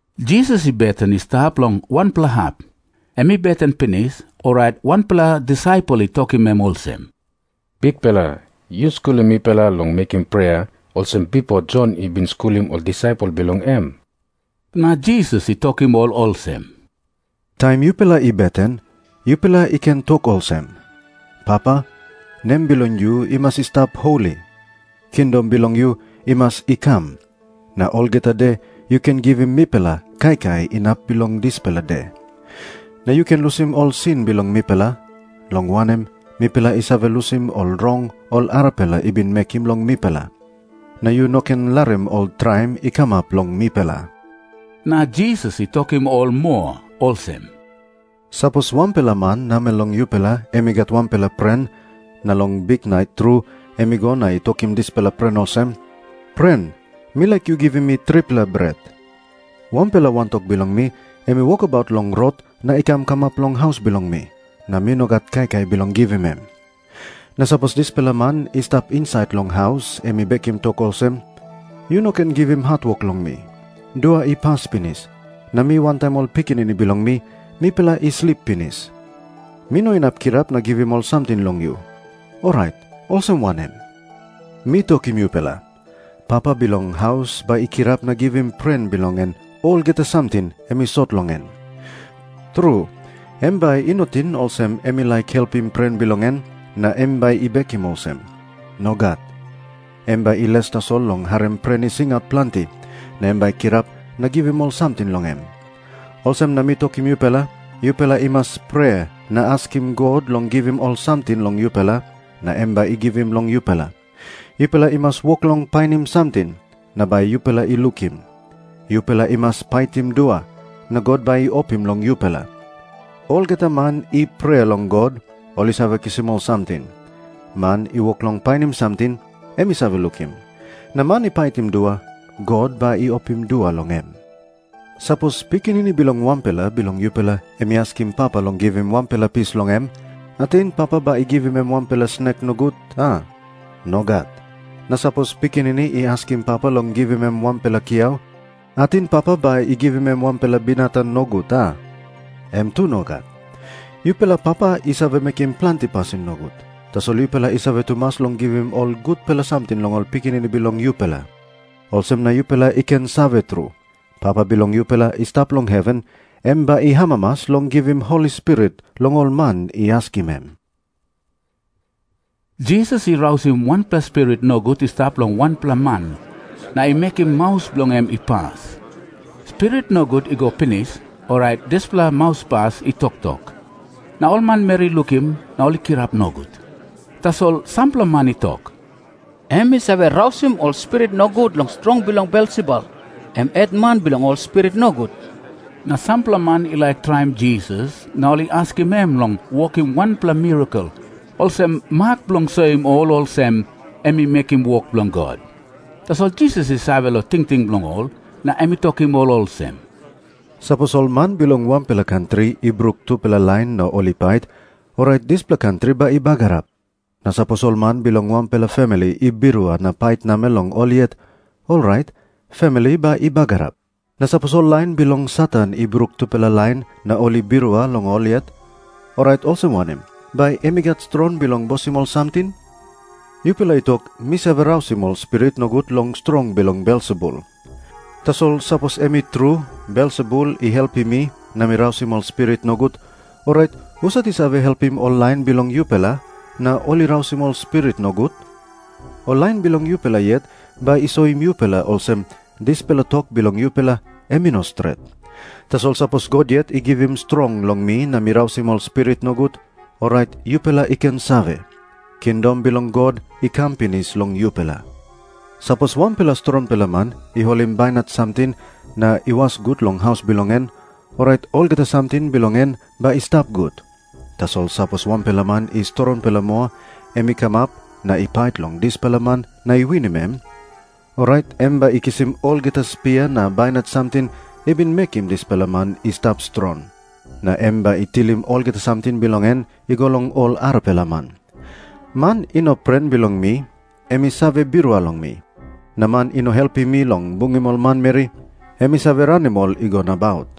Jisas i beten i stap long wanpela hap. Em i beten pinis, orait wanpela disaipel i tokim em olsem, “Bikpela, yu skulim mipela long mekim prea, olsem bipo Jon i bin skulim ol disaipel bilong em.” Na Jisas i tokim ol olsem, “Taim yupela i beten, yupela i ken tok olsem, ‘Papa, nem bilong yu i mas i stap holi. Kingdom bilong yu i mas i kam. Na olgeta de yu ken givim mipela kaikai inap bilong dispela de. Na yu ken lusim ol sin bilong mipela, long wanem, mipela i save lusim ol rong ol arapela i bin mekim long mipela. Na yu no ken larim ol traim i kamap long mipela.’” Na Jisas i tokim ol moa olsem, “Sapos wanpela man namel long yupela em i gat wanpela pren, na long biknait tru em i go na i tokim dispela pren olsem, ‘Pren, mi laik yu givim mi tripela bret. Wanpela wantok bilong mi em i wokabaut long rot na i kam kamap long haus bilong mi, na mi no gat kaikai bilong givim em.’ Na sapos dispela man i stap insait long haus em i bekim tok olsem, ‘Yu no ken givim hatwok long mi. Dua i pas pinis, na mi wantaim ol pikinini bilong mi, mipela i slip pinis. Mi no inap kirap na givim ol samting long yu.’ Orait olsem wanem? Mi tokim yupela, papa bilong haus bai i kirap na givim pren bilong en olgeta samting em i sot long en. Tru, em bai i no ting olsem em i laik helpim pren bilong en, na em bai i mekim olsem. Nogat. Em bai i les tasol long harim pren i singaut planti, na em bai i kirap na givim ol samting long em. Olsem na mi tokim yupela, yupela i mas prea na askim God long givim ol samting long yupela, na em bai i givim long yupela. Yupela i mas wok long painim samting, na bai yupela i lukim. Yupela i mas paitim dua, na God bai i opim long yupela. Olgeta man i prea long God, ol i save kisim ol samting. Man i wok long painim samting, em i save lukim. Na man i paitim dua, God bai i opim dua long em. “Sapos pikinini bilong wanpela bilong yupela em i askim papa long givim wanpela pis long em, ating papa bai i givim em wanpela snek nogut, a? Nogat. Na sapos pikinini i askim papa long givim em wanpela kiau, ating papa bai i givim em wanpela binatang nogut, a? Em tu nogat. Yupela papa i save mekim planti pasin nogut, tasol yupela i save tumas long givim ol gutpela samting long ol pikinini bilong yupela. Olsem na yupela i ken save tru, Papa bilong yupela i stap long heven em bai i amamas long givim Holi Spirit long ol man i askim em.” Jisas i rausim wanpela spirit nogut i stap long wanpela man na i mekim maus bilong en i pas. Spirit nogut i go pinis, orait dispela mauspas i toktok. Na ol manmeri i lukim na ol i kirap nogut. Tasol sampela man i tok, “Em i save rausim ol spirit nogut long strong bilong Belsebul, em hetman bilong ol spirit nogut.” Na sampela man i laik traim Jisas na ol i askim em long wokim wanpela mirakel olsem mak bilong soim ol olsem em i mekim wok bilong God. Tasol Jisas i save long tingting bilong ol, na em i tokim ol olsem, “Sapos ol man bilong wanpela kantri i bruk tupela lain na ol i pait, orait dispela kantri bai i bagarap. Na sapos ol man bilong wanpela famili i birua na pait namel long ol yet, orait famili bai i bagarap. Na sapos ol lain bilong Satan i bruk tupela lain na ol i birua long ol yet, orait olsem wanem bai em i gat strong bilong bosim ol samting? Yupela i tok, mi save rausim ol spirit nogut long strong bilong Belsebul. Tasol sapos em i tru Belsebul i save helpim mi na mi rausim ol spirit nogut, orait husat i save helpim ol lain bilong yupela, na ol i rausim ol spirit nogut? Ol lain bilong yupela yet bai i soim yupela olsem dispela tok bilong yupela em i no stret. Tasol sapos God yet i givim strong long mi na mi rausim ol spirit nogut, orait yupela i ken save, kingdom bilong God i kam pinis long yupela. “Sapos wanpela strongpela man i holim bainat samting na i was gut long haus bilong en, orait olgeta samting bilong en bai i stap gut. Tasol sapos wanpela man i strongpela moa em i kamap na i pait long dispela man na i winim em, orait em bai i kisim olgeta spia na bainat samting i bin mekim dispela man i stap strong. Na em bai i tilim olgeta samting bilong en i go long ol arapela man. “Man i no pren bilong mi, em i save birua long mi. Na man i no helpim mi long bungim ol manmeri, em i save ranim ol i go nabaut.”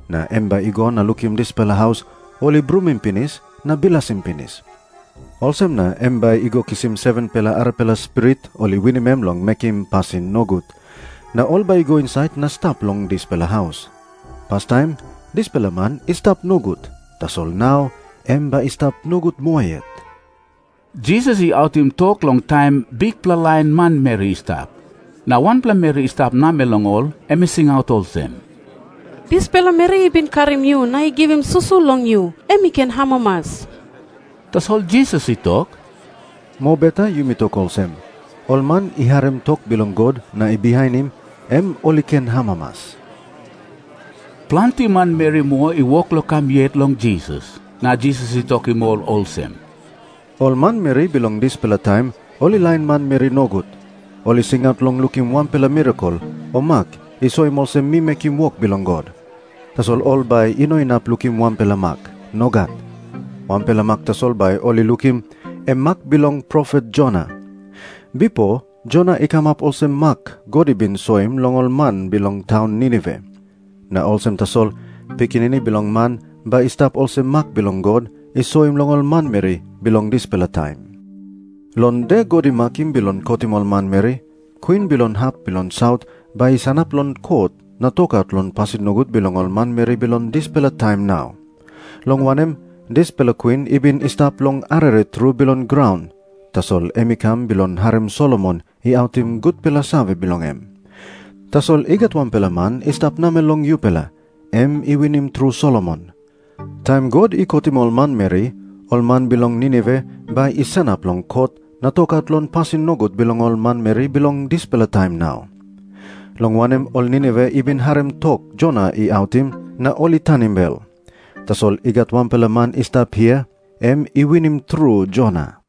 Na em bai i go na lukim dispela haus, ol i brumim pinis na bilasim pinis. Olsem na em bai i go kisim 7-pela arapela spirit ol i winim em long mekim pasin nogut. Na ol bai i go insait na i stap long dispela haus. Pastaim dispela man i stap nogut, tasol nau em bai i stap nogut moa yet.” Jisas i autim tok long taim bikpela lain manmeri i stap. Na wanpela meri i stap namel long ol em i singaut olsem, “Dispela meri i bin karim yu na i givim susu long yu, em i ken amamas.” Tasol Jisas i tok, “Mobeta yumi tok olsem, ol man i harim tok bilong God na i bihainim, em ol i ken amamas.” Planti manmeri moa i wok long kam yet long Jisas, na Jisas i tokim ol olsem, “Ol manmeri bilong dispela taim ol i lain manmeri nogut. Ol i singaut long lukim wanpela mirakel o mak i soim olsem mi mekim wok bilong God. Tasol ol bai i no inap lukim wanpela mak. Nogat. Wanpela mak tasol bai ol i lukim, em mak bilong profet Jona. Bipo Jona i kamap olsem mak God i bin soim long ol man bilong taun Ninive. Na olsem tasol Pikinini Bilong Man bai i stap olsem mak God i soim long ol manmeri bilong dispela taim. Long de God i makim bilong kotim ol manmeri, kwin bilong hap bilong saut bai i sanap long kot na tokaut long pasin nogut bilong ol manmeri bilong dispela taim nau. Long wanem, dispela kwin i bin i stap long arere tru bilong graun, tasol em i kam bilong harim Solomon i autim gutpela save bilong em. Tasol i gat wanpela man i stap namel long yupela, em i winim tru Solomon. Taim God i kotim ol manmeri, ol man bilong Ninive bai i sanap long kot na tokaut long pasin nogut bilong ol manmeri bilong dispela taim nau. Long wanem, ol Ninive i bin harim tok Jona i autim, na ol i tanim bel. Tasol i gat wanpela man i stap hia, em i winim tru Jona.”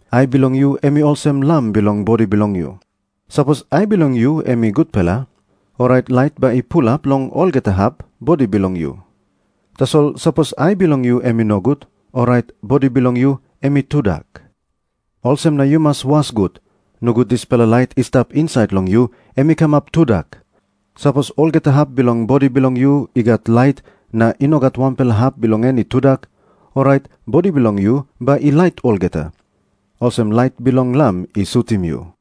Ai bilong yu em i olsem lam bilong bodi bilong yu. Sapos ai bilong yu em i gutpela, orait lait bai i pulap long olgeta hap bodi bilong yu. Tasol sapos ai bilong yu em i nogut, orait bodi bilong yu em i tudak. Olsem na yu mas was gut. Nogut dispela lait i stap insait long yu em i kamap tudak. Sapos olgeta hap bilong bodi bilong yu i gat lait, na i no gat wanpela hap bilong en i tudak, orait bodi bilong yu bai i lait olgeta, olsem lait bilong lam i sutim yu.”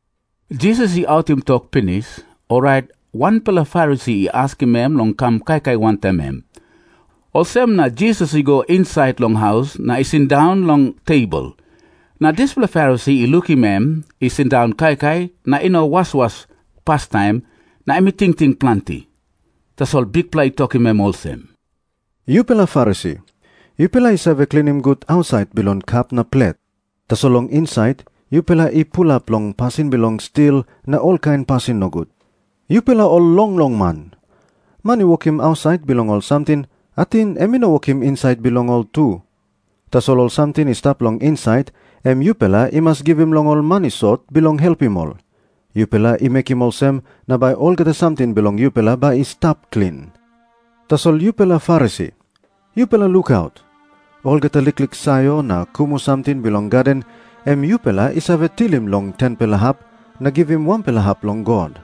Jisas i autim tok pinis, orait wanpela Farisi i askim em long kam kaikai wantaim em. Olsem na Jisas i go insait long haus na i sindaun long tebol. Na dispela Farisi i lukim em i sindaun kaikai na i no waswas pastaim, na em i tingting planti. Tasol Bikpela i tokim em olsem, “Yupela Farisi, yupela i save klinim gut ausait bilong kap na plet. Tasol long insait, yupela i pulap long pasin bilong stil na olkain pasin nogut. Yupela ol longlong man! Man i wokim ausait bilong ol samting, ating em i no wokim insait bilong ol tu? Tasol ol samting i stap long insait, em yupela i mas givim long ol man i sot, bilong helpim ol. Yupela i mekim olsem na bai olgeta samting bilong yupela bai i stap klin. “Tasol yupela Farisi, yupela lukaut. Olgeta liklik sayor na kumu samting bilong gaden em yupela i save tilim long 10-pela hap na givim wanpela hap long God.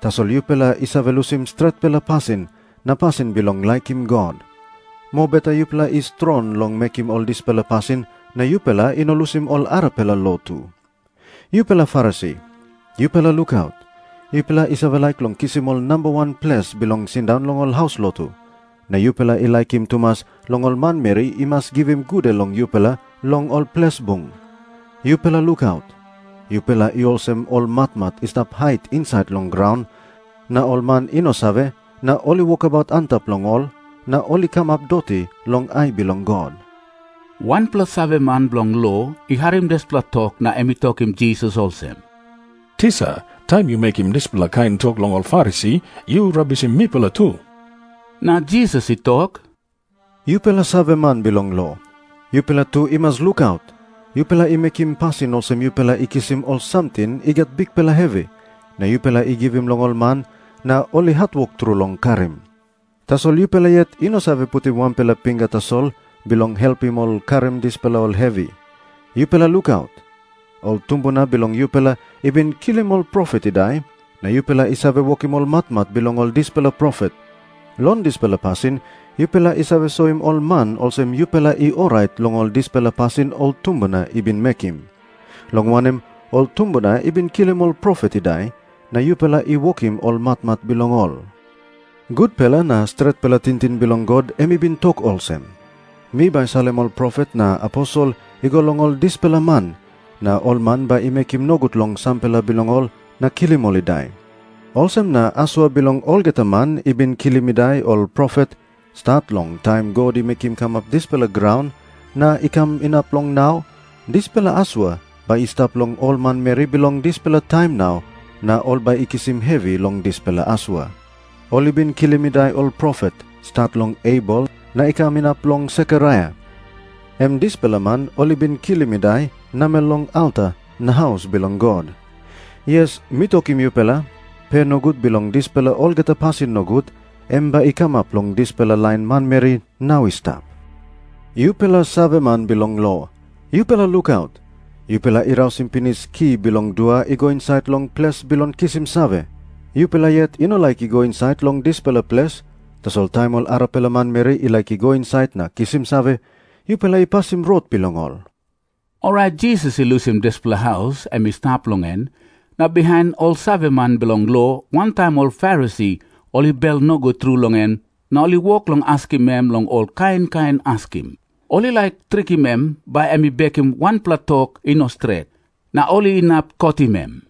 Tasol yupela i save lusim stretpela pasin na pasin bilong laikim God. Mobeta yupela i strong long mekim ol dispela pasin na yupela i no lusim ol arapela lo tu. “Yupela Farisi, yupela lukaut. Yupela i save laik long kisim ol namba wan ples bilong sindaun long ol haus lotu, na yupela i laikim tumas long ol manmeri i mas givim gude long yupela long ol ples bung. “Yupela lukaut. Yupela i olsem ol matmat i stap hait insait long graun, na ol man i no save, na ol i wokabaut antap long ol, na ol i kamap doti long ai bilong God.” Wanpela saveman bilong lo i harim dispela tok na em i tokim Jisas olsem, “Tisa, taim yu mekim dispela kain tok long ol Farisi, yu rabisim mipela tu.” Na Jisas i tok, “Yupela saveman bilong lo, yupela tu i mas lukaut. Yupela i mekim pasin olsem yupela i kisim ol samting i gat bikpela hevi, na yupela i givim long ol man, na ol i hatwok tru long karim. Tasol yupela yet i no save putim wanpela pinga tasol bilong helpim ol long karim dispela ol hevi. “Yupela lukaut. Ol tumbuna bilong yupela i bin kilim ol profet i dai, na yupela i save wokim ol matmat bilong ol dispela profet. Long dispela pasin yupela i save soim ol man olsem yupela i orait long ol dispela pasin ol tumbuna i bin mekim. Long wanem, ol tumbuna i bin kilim ol profet i dai, na yupela i wokim ol matmat bilong ol. “Gutpela na stretpela tingting bilong God em i bin tok olsem, ‘Mi bai salim ol profet na aposel i go long ol dispela man, na ol man bai i mekim nogut long sampela bilong ol na kilim ol i dai.’ Olsem na asua bilong olgeta man i bin kilim i dai ol profet, stat long taim God i mekim kamap dispela graun na i kam inap long nau, dispela asua bai i stap long ol manmeri bilong dispela taim nau na ol bai i kisim hevi long dispela asua. Ol i bin kilim i dai ol profet, stat long Abel na i kam inap long Sekaraia, em dispela man ol i bin kilim i dai namel long alta na haus bilong God. Yes, mi tokim yupela, pe nogut bilong dispela olgeta pasin nogut, em bai i kamap long dispela lain manmeri nau i stap. “Yupela saveman bilong lo, yupela lukaut. Yupela i rausim pinis ki bilong dua i go insait long ples bilong kisim save. Yupela yet i no laik i go insait long dispela ples, tasol taim ol arapela manmeri i laik i go insait na kisim save, yupela i pasim rot bilong ol.” Orait Jisas i lusim dispela haus em i stap long en, na bihain ol saveman bilong lo wantaim ol Farisi ol i bel nogut tru long em na ol i wok long askim em long ol kain kain askim. Ol i laik trikim em, bai em i bekim wanpela tok i no stret, na ol inap kotim em.